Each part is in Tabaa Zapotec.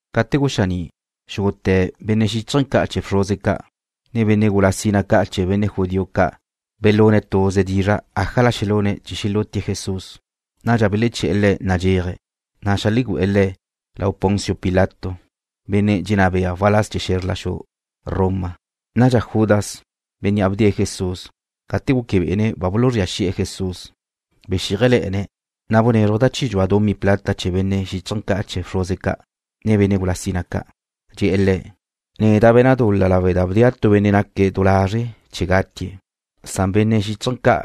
Gate guxaní', xúgute̱ benne' xíchaje̱ ca' chee̱ bxruze ca', ne benne' gula sina ca' chee̱ benne' judío ca' belune̱' tuze dizra' ájala xelune̱' chee̱ xelútie̱' Jesús. Nadxa beleché̱'e̱ Le̱' nadxéaje̱', ne xeajlegu'e̱ Le̱' lau Poncio Pilato, benne' dxenná be'e waláz chee̱ xezr la xu Roma. Nadxa Judas, bénnea' bdee̱' Jesús, gate guque bé'ene̱' ba buluzría xi'e̱ Jesús, bexíajele̱'e̱ne̱', na' bunézruje̱' da chi dxua dumí plata lau benne' xíchaje̱ ca' chee̱ bxruze ca', ne benne' gula sina ca'. Dxe̱'e̱ le̱': ―Neda' be̱na' dul-la lawe' da bdea' tu benne' naque̱' du lazre' chee̱ gatie̱'. Belexeche̱be benne' xíchaje̱ ca':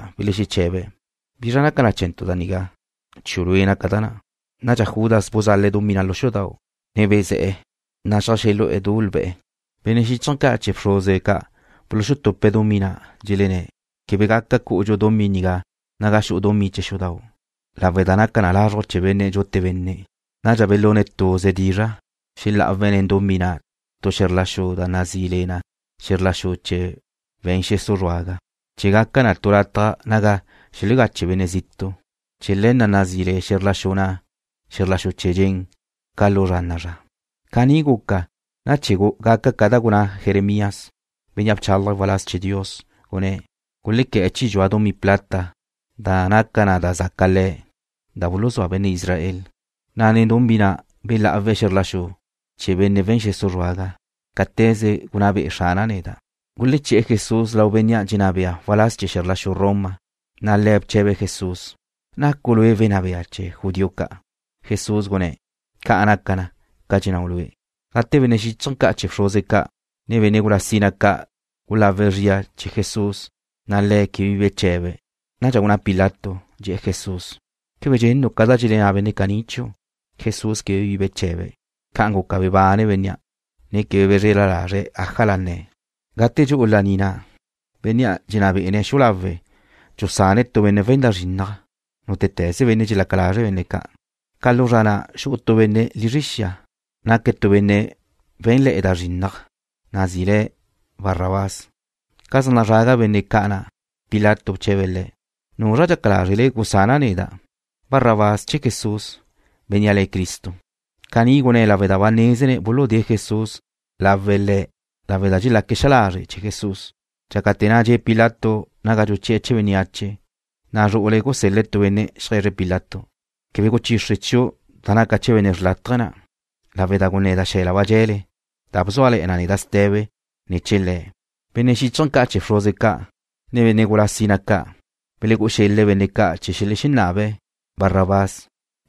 ―¿Bizra naca chee̱ntu' da nigá? Chiu' lue' naca da na'. Nadxa Judas buzale̱' dumí na' lu xudau', ne bezé̱'e̱, na' xeajxelú'u du lbe̱'e̱. Benne' xíchaje̱ ca' chee̱ bxruze ca' buluxutupe̱' dumí na', dxelenné̱': ―Quebe gaca cú'udxu dumí nigá naga xu'u dumí chee̱ xudau', lawe' da naca na lazruj chee̱ benne' dxute benne'. Nadxa belune̱' tuze dizra' xelá'awe̱' tu xe̱zr la xu nen dumí na' da nazí le na xe̱zr la xu chee̱ we̱n xesu' zruaga, chee̱ gaca na tu lataj naga xelegache benne' zitu'. Chee̱ le̱ na' nazí le xe̱zr la xu na' Xe̱zr La Xu Chee̱ Dxen ca lu zra na'a zra. Caní guca na chee̱ gaca ca da gunná Jeremías, benne' bchálaje̱' waláz chee̱ Dios, gunné̱': “Gulequé̱'e̱ chi dxua dumí plata da naca na da zaca Le̱' da buluzúa benne' Israel. Nen dumí na' belá'awe̱' xe̱zr la xu chee̱ benne' we̱n xesu' zruaga, cáte̱ze gunná be'e Xrana' neda'.” Guleché̱'e̱ Jesús lau bénnea' dxenná be'e̱ waláz chee̱ xe̱zr la xu Roma, na' le̱' bche̱be̱' Jesús: ―¿Nacu' Lue' Wenná Bea chee̱ judío ca'? Jesús gunné̱': ―Ca' naca na, ca dxennáu' lue'. Gate benne' xíchaje̱ ca' chee̱ bxruze ca', ne benne' gula sina ca' gulawe̱' zria chee̱ Jesús, na' Le̱' quebe bi beche̱be̱'. Nadxa gunná Pilato, dxe̱'e̱ Jesús: ―¿Quebe dxennu' ca da dxelenná benne' caní chiu'? Jesús quebe bi beche̱be̱'. Ca'an guca bebanne bénnea', ne quebe bezrela lazre̱' ájala nne̱'. Gate dxu'u laní na', bénnea' dxenná be'e̱ na' xu'u lawe̱' dxusane̱' tu benne' we̱n da zrinnaj, nútete̱ze benne' dxelaca lazre' benne' ca'. Ca lu zra na' xu'u tu benne' lizre xia, benne' wé̱nle̱'e̱ da zrinnaj, nazí le̱' Barrabás. Ca zaj nazraga benne' ca' na', Pilato bche̱be̱' le̱': ―¿Nuzra dxaca lázrele gusana' neda'? ¿Gusana' Barrabás, che Jesús, bénnea' le̱' Cristo? Caní gunné̱' lawe' da ba nézene̱' buludée̱' Jesús lawe̱' le̱' lawe' da dxelaque̱' xa lazre' chee̱ Jesús. Dxácate̱ na' dxe' Pilato naga dxuchi'e̱ chee̱ bénneache, na' zru'ule̱' gusel-le̱' tu benne' xeaje̱zre̱' Pilato: “Quebe guchixre chiu' da naca chee̱ benne' xrlátaje na', lawe' da guneda' xe̱la ba dxe̱le, da bzúale̱'e̱ na neda' ste̱be ne̱ chee̱ Le̱'.” Benne' xíchaje̱ ca' chee̱ bxruze ca', ne benne' gula sina ca' belegú'u xele̱' benne' ca' chee̱ xelenabe̱' la Barrabás,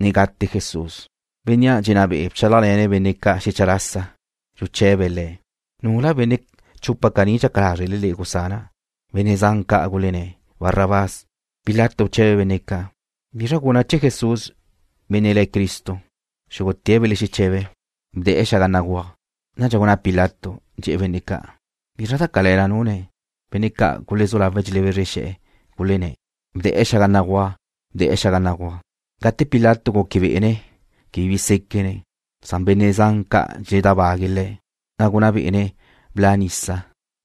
ne gate Jesús. Bénnea' dxenná be'e̱ bchálajle̱ne̱' benne' ca' xecha lasa. Buche̱be̱' le̱': ―¿Nula benne' chupa caní dxaca lázrele le'e gusana'? Benne' zan ca' gulenné̱': ―Barrabás. Pilato bche̱be̱' benne' ca': ―¿Bizra guna' chee̱ Jesús, benne' le̱' Cristo? Xúgute̱' belexeche̱be̱': ―Bde̱'e̱ xaga béguaj. Nadxa gunná Pilato, dxe̱'e̱ benne' ca': ―¿Bizra da cale̱la nune̱'? Benne' ca' gulezú lawe̱' dxelebezre xe̱'e̱, gulenné̱': ―Bde̱'e̱ xaga béguaj. Bde̱'e̱ xaga béguaj. Gate Pilato guque bé'ene̱' quebe bi séquene̱', na' benne' zan ca' dxeledábague̱' le̱', na' gunná bé'ene̱' bla' nisa,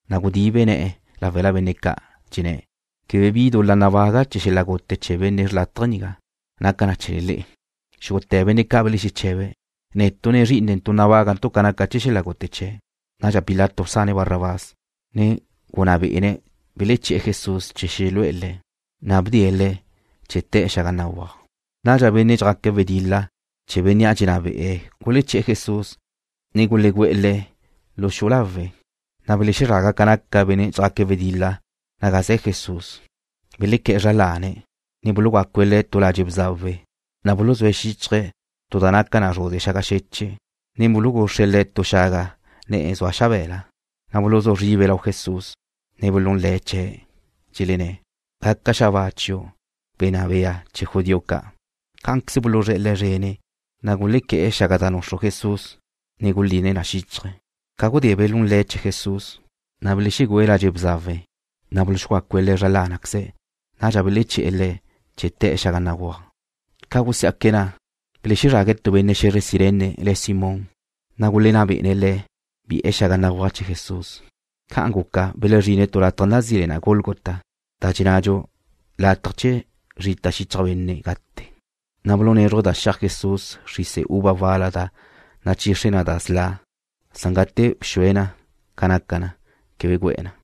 na' gudibe ne̱'e̱ láwela benne' ca', dxenné̱': ―Quebe bi dul-la nabaga' chee̱ xel-la' gute chee̱ benne' xrlátaje nigá. Naca na chee̱le le'e. Xúgute̱ benne' ca' belexeche̱be̱': ―Netu', ne zrí'inentu' nabágantu' ca naca chee̱ xel-la' gute chee̱'. Nadxa Pilato bsane̱' Barrabás, ne gunná bé'ene̱' beleché̱'e̱ Jesús chee̱ xelu'e̱ Le̱', na' bdee̱' Le̱' chee̱ te̱'e̱ xaga béguaj. Nadxa benne' dxjaque̱' wedil-la chee̱ bénnea' dxenná be'e̱ guleché̱'e̱ Jesús, ne gulegú'e̱ Le̱' lu xu'u lawe'. Belexezraga ca naca benne' dxjaque̱' wedil-la naga ze̱ Jesús. Belequé̱'e̱ zra lane̱', ne bulugácue̱' Le̱' tu ladxe' bzawe. Buluzúe̱' xíchaje̱' tu da naca na zruze xaga xeche', ne buluguxre̱' Le̱' tu xaga ne̱'e̱ xabe̱la. Nadxa buluzú zribe̱' lau Jesús, ne belún le̱' chee̱', dxelenné̱': ―Gaca xabáa chiu', Wenná Bea chee̱ judío ca'. Cá'anqueze buluzré̱'e̱ Le̱' zrene̱', na' gulequé̱'e̱ xaga da nuxru Jesús, ne guline̱' na xíchaje̱'. Ca gudé belún le̱' chee̱ Jesús, na' belexegüe̱' ladxe' bzawe, na' buluxugácue̱' Le̱' zra lánaqueze̱'. Nadxa beleché̱'e̱ Le̱' chee̱ te̱'e̱ xaga béguaj. Ca gusiá'que̱' na', belexezrague̱' tu benne' xe̱zre Cirene, le̱' Simón, na' gulenná bé'ene̱' le̱' bi'e̱ xaga béguaj chee̱ Jesús. Ca'an guca belezrine̱' tu lataj nazí le na Gólgota, da dxennadxu, Lataj Chee̱ Zrita Xichaj Benne' Gate. Na' bulunézruje̱' da xi'aj Jesús xrise uva wal-la da nachixre na da sla', san gate bxue Jesús ca naca na, quebe gu'e̱ na.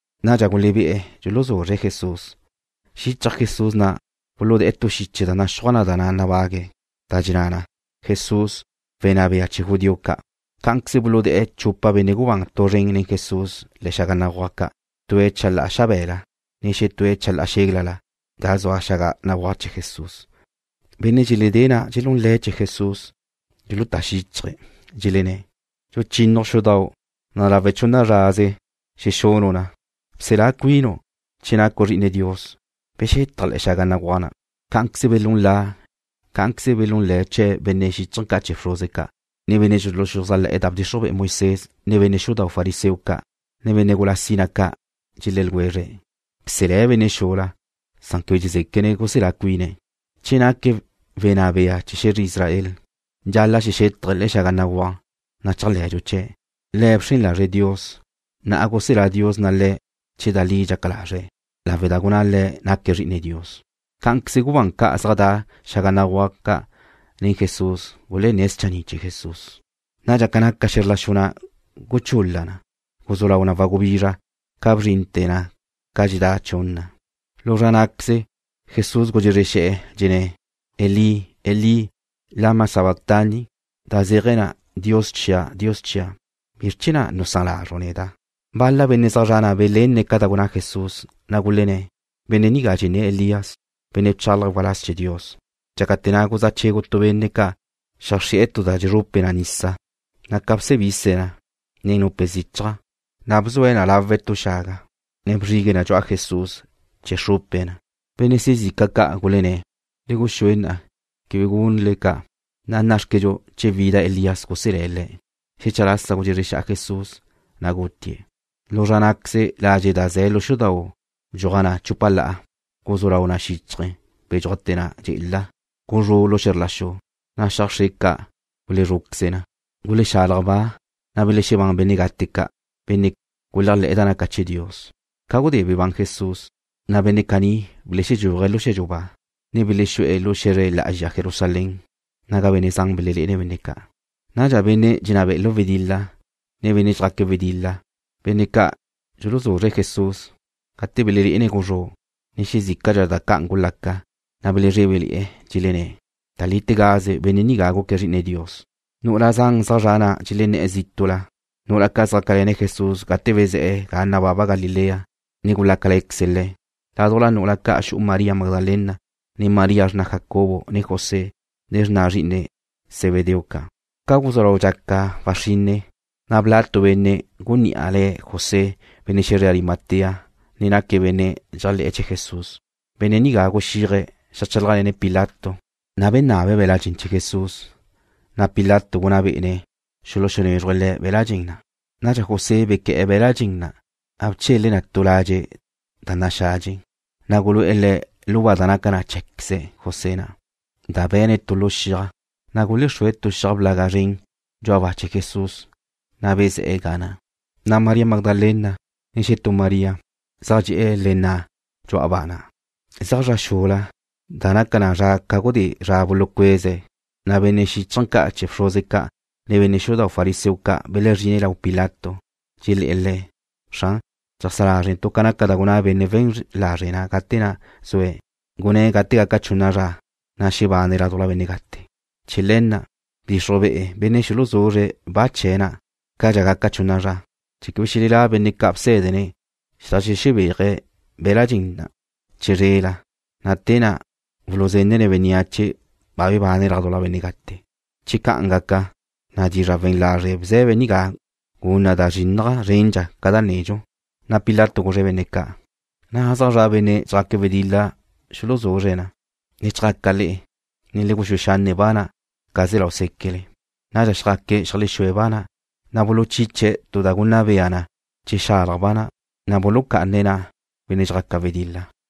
Nadxa gulebé'e̱ dxuluzuzre̱' Jesús. Buluzríe̱' xichaj Jesús na' tu xiche da naxúaj na da nabague̱', da dxenná na: Jesús, wenná bea chee̱ judío ca'. Cá'anqueze buludé̱'e̱ chupa benne' gubán tu zren nen Jesús le̱'e̱ xaga béguaj ca', tue̱' chalá'a xabe̱la, ne xetúe̱' chalá'a xéglala ga da' xaga béguaj chee̱ Jesús. Benne' dxeledée̱' na' dxelún le̱' chee̱ Jesús. Dxulutá xíchaje̱', ne dxelenné̱': ―¿Dxuchínnaju' xudau', na' lawe' chunna zraze xexunu' na? Bselá cuinu'. Che nacu' Zri'ine Dios, bexetaj le̱'e̱ xaga béguaj na'. Cá'anqueze belún la chee̱' benne' xíchaje̱ ca' chee̱ bxruze ca', ne benne' dxuluxuzájle̱'e̱ da bdxixruj be'e Moisés, ne benne' xudau' fariseo ca', ne benne' gula sina ca'. Dxelé̱ ljwezre̱': ―Bselé̱' benne' xula, san quebe dxezéquene̱' guselá cuine̱'. Che naque̱' Wenná Bea Chee̱ Xe̱zre Israel, dxal-la' xexétaje̱' le̱'e̱ xaga béguaj, na' chéajle̱dxu chee̱'. Le̱' bxren lazre̱' Dios. Na'a guselá Dios Le̱' che da li dxaca lazre̱', lawe' da gunná Le̱' naque̱' Zri'ine Dios. Cá'anqueze gubán ca' zaj da' xaga béguaj ca' nen Jesús gulenné̱' schanni' chee̱ Jesús. Nadxa ca naca xe̱zr la xu na' guchul-la na. Guzú lau na wagubizra ca bzrinte̱ na ca dxedá chunna. La ná'queze Jesús gudxezre xe̱'e̱, dxenné̱': ―Elí, Elí, ¿lama sabactani? (Da nigá zéaje̱ na: Dios chia', Dios chia', ¿bizr chee̱ na' nusán lazru' neda'?) Bal-la benne' zaj zre̱'e̱ na' belenne̱' ca da gunná Jesús, na' gulenné̱': ―Benne' nigá dxenné̱' Elías, benne' bchálaje̱' waláz chee̱ Dios. Dxácate̱ na' guzá' chegu tu benne' ca', xeajxrí'e̱ tu da dxezrupe nisa, na' ca bsebise̱' na nen nupe zichaj, na' bzue̱' na lawe' tu xaga, ne bzrigue̱' na dxu'a Jesús chee̱ xrupe̱' na. Benne' xezica ca' gulenné̱': ―Le guxúe xca'. Quebe gunu' ca'. Nná'xquedxu che wida Elías guselé̱' Le̱'. Xecha lasa gudxezre xa'a Jesús, na' gutie̱'. Lu zra ná'queze ladxe' da ze̱ lu xudau' bdxuaj na chúpala, guzú lau na xíchaje̱, bedxúajte̱ na dxe'ela. Guzrú' xe̱zr la xu, na' xiaj xre ca' gulúzruqueze na. Gulexalaj ba, na' belexebán benne' gate ca', benne' guléajle̱'e̱ da naca chee̱ Dios. Ca gudé bebán Jesús, na' benne' caní belexedxúaje̱' lu xe̱dxu ba, ne belexexú'e̱ lu xe̱zre lá'azxa Jerusalén, naga benne' zan belelé'ene̱' benne' ca'. Nadxa benne' dxenná be'e̱ lu wedil-la, ne benne' dxjaque̱' wedil-la, benne' ca' dxuluzuzre̱' Jesús, gate belelé'ene̱' guzrú', ne xezícadxa da ca'an gulaca, na' belezrébele̱'e̱, dxelenné̱': ―Da lítegaze benne' nigá guque̱' Zri'ine Dios. Nu'ula zan zaj zre̱'e̱ na' dxelenné̱'e̱ zítu'la, nu'ula ca' xjácale̱ne̱' Jesús gate bezé̱'e̱ ga nababa Galilea, ne gulácale̱queze̱' Le̱'. Ládujla nu'ula ca' xu'u María Magdalena, ne María xrna Jacobo ne José, ne xrna zri'ine Zebedeo ca'. Ca guzú lau dxaca waxrinne, na' bla' tu benne' gunní'a le̱' José, benne' xe̱zre Arimatea, benne' dxéajle̱queze̱' chee̱ Jesús. Benne' nigá guxíaje̱' xeajchálajle̱ne̱' Pilato, na' benabe̱' be̱l-la' dxen chee̱ Jesús. Pilato gunná bé'ene̱' xulunézruje̱' le̱' be̱l-la' dxen na'. Nadxa José bequé̱'e̱ be̱l-la' dxen na', na' bchele̱' na tu ladxe' da naxadxe. Nadxa gulu'e̱ Le̱' lu ba da naca na cheé̱queze José na', da be̱ne̱' tu lu xiaj. Gulexrúe̱' tu xiaj blaga zren dxu'a ba chee̱ Jesús, na' bezé̱'e̱ ga na'. Gulezrá' María Magdalena, ne xetú María, zaj dxe'e̱ le nna' dxu'a ba na'. Zeaj zra xula, da naca na zra ca gudé zra bulucueze̱', na' benne' xíchaje̱ ca' chee̱ bxruze ca', ne benne' xudau' fariseo ca' belezrine̱' lau Pilato. Dxelé̱'e̱ le̱': ―Xran, dxeajsá lázrentu' ca naca da gunná benne' we̱n lazre' na' gate na' zue̱'. Gunné̱' gate gaca chunna zra, na' xebane̱' ládujla benne' gate. Chee̱ le̱ na', bdixruj be'ene̱' benne' ca' xulubia xuluxue̱' ba chee̱' na' cadxa gaca chunna zra, chee̱ quebe xelelá' benne' ca' bsé̱dene̱' xedajlexebéaje̱' be̱l-la' dxen na' chizrela, na' te na' xuluzenne̱' bénneache ba bebane̱' ládujla benne' gate. Che ca'an gaca, na' dizra' we̱n lazre' bze̱be nigá gun na da zrinnaj zrendxa ca da nedxu. Pilato guzre̱' benne' ca': ―Na' zaj zra' benne' dxjaque̱' wedil-la xuluzuzre̱' na. Le chjaca le'e, ne le guxúe xanne' ba na' ca se̱ lau séquele. Nadxa xjaque̱', xeajlexúe̱' ba na'. Buluchiche̱' tu da gunna bea na che xalaj ba na', na' bulucá'ane̱' benne' dxjaca wedil-la ga na'.